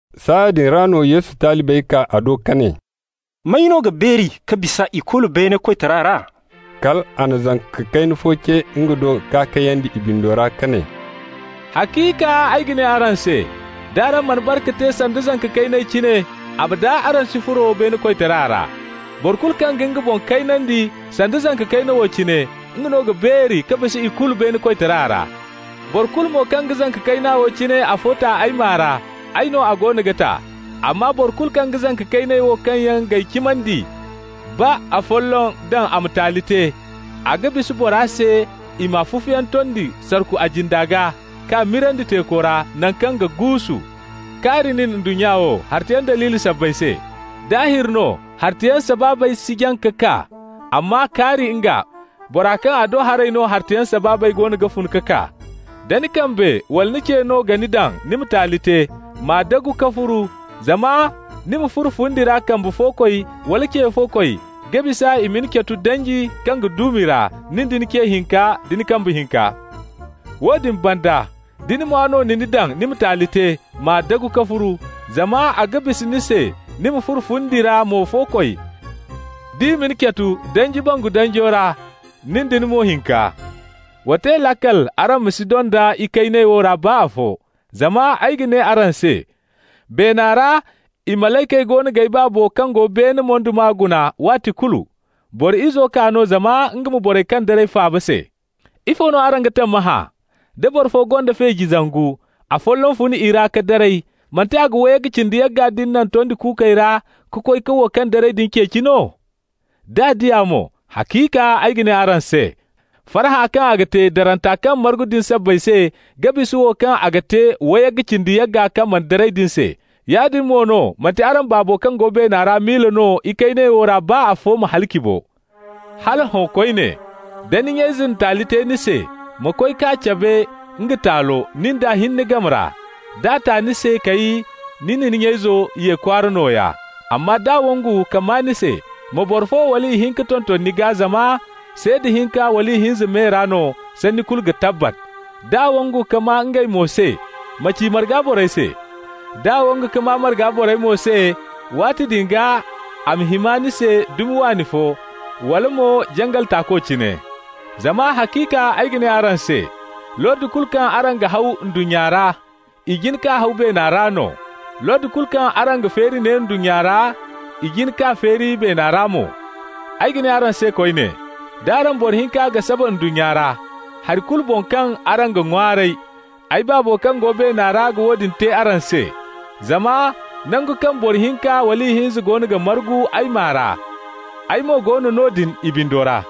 Saaya din ra no Yesu talibey kaa a do ka ne: «May no ga beeri ka bisa ikulu beene koytara ra?» Kal a na zanka kayna fo ce nga do k'a kayandi i bindo ra, ka ne: «Haciika ay ga ne araŋ se: d'araŋ mana bare ka te sanda zanka kayney cine, abada araŋ si furo beene koytara ra. Boro kulu kaŋ ga nga boŋ kaynandi sanda zanka kayna wo cine, nga no ga beeri ka bisa ikulu beene koytara ra. Boro kulu mo kaŋ ga zanka kayna wo cine afo ta ay maa ra, ay no a goono ga ta. Amma boro kulu kaŋ ga zanka kayney wo kaŋ yaŋ g'ay cimandi ra baa afolloŋ daŋ a ma taali te, a ga bisa bora se i ma fufuyaŋ tondi sarku a jinde gaa k'a mirandi teeku ra, naŋ kaŋ ga guusu. Kaari nin, ndunnya wo, hartayaŋ daliiley sabbay se! Daahir no, hartayaŋ sabaabey si jaŋ ka kaa, amma kaari nga, bora kaŋ a do haray no hartayaŋ sabaabey goono ga fun ka kaa. Da ni kambe wala ni ce no ga ni daŋ ni ma taali te, m'a dumbu ka furu. Zama ni ma furo fundi ra kambe-fo-koy wala ce-fo-koy ga bisa i ma ni catu danji kaŋ ga duumi ra, nin da ni ce hinka da ni kambe hinka. Woodin banda, da ni mwa no na ni daŋ ni ma taali te, m'a dagu ka furu. Zama a ga bisa ni se ni ma furo fundi ra mo-fo-koy, d'i ma ni catu danji bangu danjo ra, nin da ni mo hinka. Wa te laakal araŋ ma si donda ikayney wo ra baa afo, zama ay ga ne araŋ se, beena ra i malaykey goono g'ay Baabo kaŋ go beene moyduma guna waati kulu. Boro Izo kaa no zama nga ma borey kaŋ daray faaba se. Ifo no araŋ ga tammahã? Da boro fo gonda feeji zangu, afolloŋ fun i ra ka daray, manti a ga wayga cindi yagga din naŋ tondi kuukey ra ka koy ka wo kaŋ daray din ceeci no? D'a di a mo, haciika ay ga ne araŋ se, farhã kaŋ a ga te daranta kaŋ margu din sabbay se ga bisa wo kaŋ a ga te wayga cindi yagga kaŋ yaŋ mana daray din se. Yaadin mo no, manti araŋ Baabo kaŋ go beena ra miila no ikayney wo ra baa afo ma halaci bo. Hala hõ koyne, da ni nya-ize na taali te ni se, ma koy k'a cabe nga taalo, nin d'a hinne game ra. D'a ta ni se, kay, ni na ni nya-izo ye kwaara nooya. Amma d'a wangu ka maa ni se, ma boro fo wala ihinka tonton ni gaa, zama ‹seeda hinka wala ihinza me ra no sanni kulu ga tabbat.› D'a wangu ka maa ngey mo se, ma ci marga borey se. D'a wangu ka maa marga borey mo se, waati din gaa a ma hima ni se dumi waani fo, wala mo jangal taako cine. Zama haciika ay ga ne araŋ se: Lordi kulu kaŋ araŋ ga haw ndunnya ra, i jin k'a haw beena ra no. Lordi kulu kaŋ araŋ ga feeri ne ndunnya ra, i jin k'a feeri beena ra mo. Ay ga ne araŋ se koyne: d'araŋ boro hinka ga saba ndunnya ra, hari kulu boŋ kaŋ araŋ ga ŋwaaray, ay Baabo kaŋ go beena ra ga woodin te araŋ se. Zama nangu kaŋ boro hinka wala ihinza goono ga margu ay maa ra, ay mo go no noodin i bindo ra.»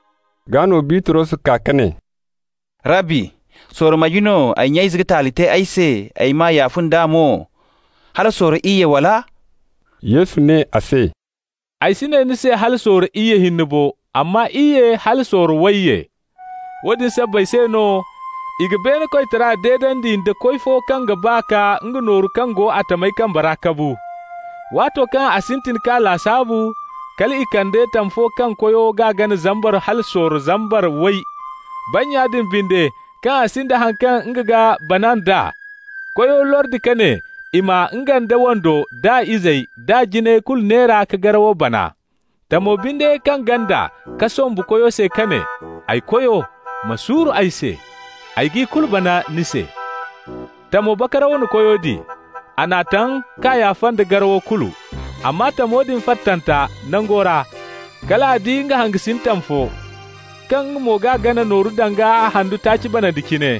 Gaa no Bitros kaa ka ne: «Rabbi sorro marge no ay nya-ize ga taali te ay se, ay m'a yaafa nd'a mo? Hala sorro iyye, wala?» Yesu ne a se: «Ay si ne ni se hala sorro iyye hinne bo, amma iyye hala sorro wayye. Woodin sabbay se no i ga beene koytara deedandi nda koy fo kaŋ ga ba ka nga nooru kaŋ go a tamyaŋ kambe ra kabu. Waato kaŋ a sintin k'a lasaabu, kal i kande tam fo kaŋ koyo g'a gana zambar hala sorro zambar way. Bannya din binde, kaŋ a sinda haŋ kaŋ nga ga bana nd'a, koyo lordi ka ne i ma nga nd'a wando nd'a izey d'a jinayey kulu neera ka garawo bana. Tamo binde kaŋ ganda ka sombu koyo se ka ne: ‹Ay koyo, ma suuru ay se. Ay g'i kulu bana ni se.› Tamo bakaraw na koyo di. A n'a taŋ k'a yaafa nda garawo kulu. Amma tamo din fattanta nango ra, kal a di nga hangasin tam fo, kaŋ nga mo g'a gana nooru danga handu taaci banandi cine.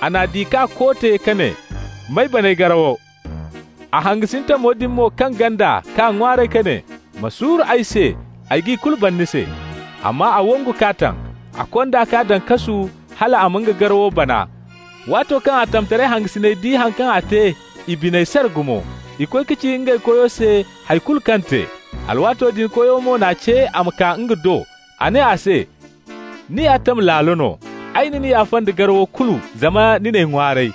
A n'a di k'a koote ka ne: ‹M'ay bana ay garawo!› A hangasin tamo din mo kaŋ ganda k'a ŋwaaray ka ne: ‹Ma suuru ay se, ay g'i kulu bana ni se.› Amma a wangu k'a taŋ. A kond'a k'a daŋ kasu hal a ma nga garawo bana. Waato kaŋ a tamtaray hangasiney di haŋ kaŋ a te, i biney sara gumo. I koy ka ci ngey koyo se hay kulu kaŋ te. Alwaato din koyo mo n'a ce a ma kaa nga do. A ne a se: ‹Ni ya tam laalo no. Ay na ni yaafa nda garawo kulu zama ni n'ay ŋwaaray.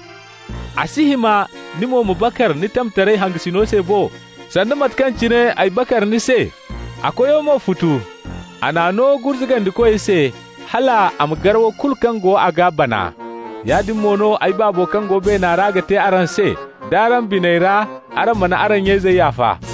A si hima ni mo ma bakar ni tamtaray hangasino se bo, sanda mate kaŋ cine ay bakar ni se?› A koyo mo futu. A n'a no gurzugandikoy se, hal a ma garaw kulu kaŋ go a gaa bana. Yaadin mo no ay Baabo kaŋ go beena ra ga te araŋ se, d'araŋ biney ra araŋ mana araŋ nya-izey yaafa.»